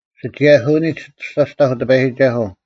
ᓯᒋᔭᓯᐅᓂᒡ ᐊᑐᔅᒐᑕᐧᒄ ᑎᐸᔨᒋᒐᓱᐤ: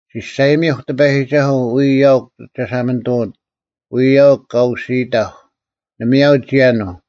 ᒋᔅᒐᔨᒥᐧᒄ ᑎᐸᔨᒋᒐᓱᐤ ᐎᔾ ᐊᐅᒄ ᒐᓴᒪᓂᑐᐅᑦ: ᐎᔾ ᐊᐅᒄ ᑲ ᐅᓯᐃᑕᐧᒄ, ᓇᒪᔭᐤ ᒋᔭᓄᐤ;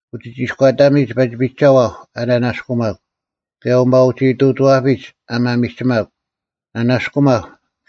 ᐅᒋᒋᐃᔎᑕᒥᒡ ᐸᒋ ᐱᒐᐛᐧᒄ ᐊ ᓂᓇᔅᑯᒪᒄ, ᑭᔭ ᐅᒪᐅᒋᐃᑐᐅᒋᐛᐱᒡ ᐊ ᒪᒥᒋᒪᒄ: ᓂᓇᔅᑯᒪᐧᒄ,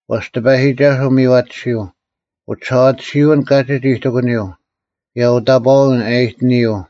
ᐛᔅ ᑎᐸᔨᒋᒐᓱᐤ ᒥᔽᑎᓯᐤ; ᐅᒋᓴᐛᑎᓯᐅᓐ ᑲᒋᒡ ᐃᑎᑯᓂᔪᐤ; ᑭᔭ ᐅᑕᑈᐅᓐ ᐊᔨᑎᓂᔪᐤ,